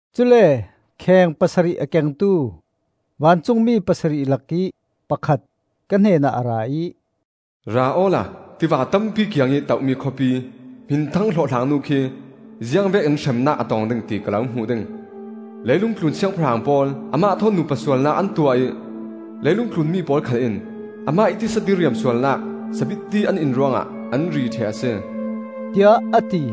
Cule kheng pasarih a kengtu vancungmi pasarih lakih pakhat ka hnenah a ra ih, “Ra awla tiva tampi kiangih toh-mi khawpi, hminthang hlawhhlangnu khi ziangvekin hremnak a tong ding, ti ka lo hmuh ding. Leilung tlun siangpahrang pawl amah thawn nupa sualnak an tuah ih leilungtlun mi pawl khal in amah ih tisa diriam sualnak sabitti an in ruangah an ri ṭheh a si,” tiah a ti.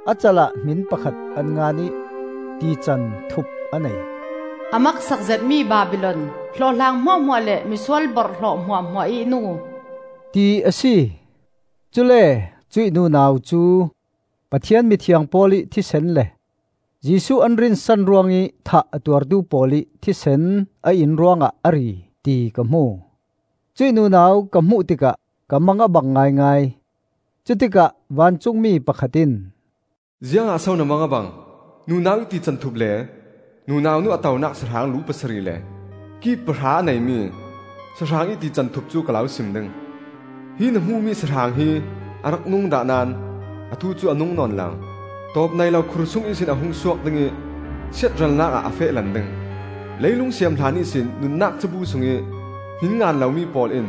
A cal ah hmin pakhat an ngan ih tican thup a nei. “A maksak zetmi Babilon, hlawhhlang hmuahhmuah le misual borhhlawh hmuahhmuah ih nu,” ti a si. Cule cuih nunau cu Pathian mithiang pawl ih thisen le Jesuh an rinsan ruangih thah a tuartu pawl ih thisen a in ruangah a ri, ti ka hmu. Cuih nunau ka hmuh tikah ka mang a bang ngaingai. Cutikah vancungmi pakhat in, “Ziangah so na mang a bang? Nunau ih tican thup le nunau nu a tonak sahrang lu pasarih le ki pahra a nei mi sahrang ih tican thup cu ka lo sim ding. Hi na hmuhmi sahrang hi a rak nung dah naón atu cu a nung nawn lo; tawpneilo khur sung ihsin a hung suak ding ih siatralnak ah a feh lan ding. Leilung siam hlan ihsin nunnak cabu sungih hmin ngan lomi pawl in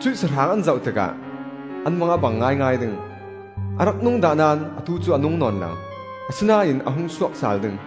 cuih sahrang an zoh tikah an mang a bang ngaingai ding. A rak nung dah naón atu cu a nung nawn lo; asinain a hung suak sal ding.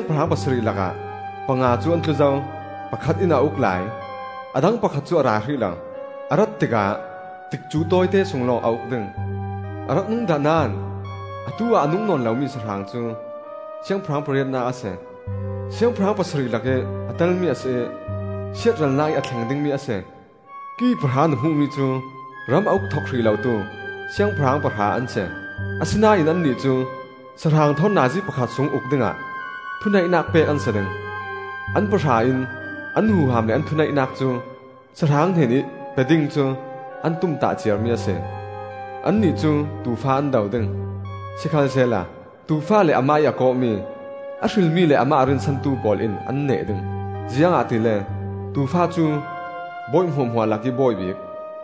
Cuih siangpahrang pasarih lakah panga cu an tlu zo; pakhat in a uk lai; a dang pakhat cu a ra hrih lo. A rat tikah tikcu tawite sung lawng a uk ding. A rak nung dah naón atu-ah a nung nawn lomi sahrang cu siangpahrang pariatnak a si; siangpahrang pasarih lakih a telmi a si ih siatralnak ih a thleng dingmi a si. “Ki pahra na hmuhmi cu ram a uk thok hrih lotu siangpahrang pahra an si; asinain annih cu sahrang thawn nazi pakhat sung uk dingah thuneihnak pek an si ding. An pahra in an huham le an thuneihnak cu sahrang hnenih pe ding cu an tumtah ciarmi a si. Annih cu Tuufa an do ding; sikhalsehla Tuufa le amah ih a kawhmi, a hrilmi le amah a rinsantu pawl in an neh ding, ziangahtile Tuufa cu bawi hmuahhmuah lakih Bawi bik,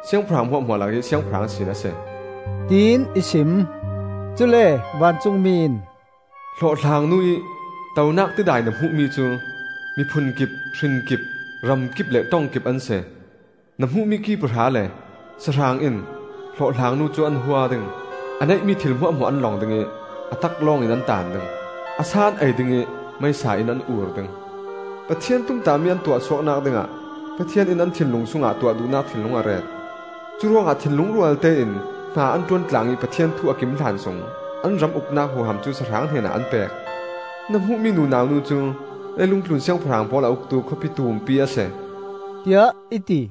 siangpahrang hmuahhmuah lakih Siangpahrang sin a si,” tiin i sim. Cule vancungmi in, “Hlawhhlang nu ih tonak tidai na hmuhmi cu miphun kip, hrin kip, ram kip le ṭong kip an si. Na hmuhmi ki pahra le sahrang in hlawhhlang nu cu an hua ding; a neihmi thil hmuahhmuah an long ding ih a taklawngin an taan ding; a sa an ei ding ih meisa in an ur ding. Pathian tumtahmi an tuahsuaknak dingah Pathian in an thinlung sungah tuah duhnak thinlung a ret. Curuangah thinlung rualtein hna an ṭuan tlang ih Pathian thu a kim hlan sung an ram uknak huham cu sahrang hnenah an pek. “Na hmuhmi nunau cu leilung tlun siangpahrang pawl a uktu khawpi tumpi a si,” tiah i ti.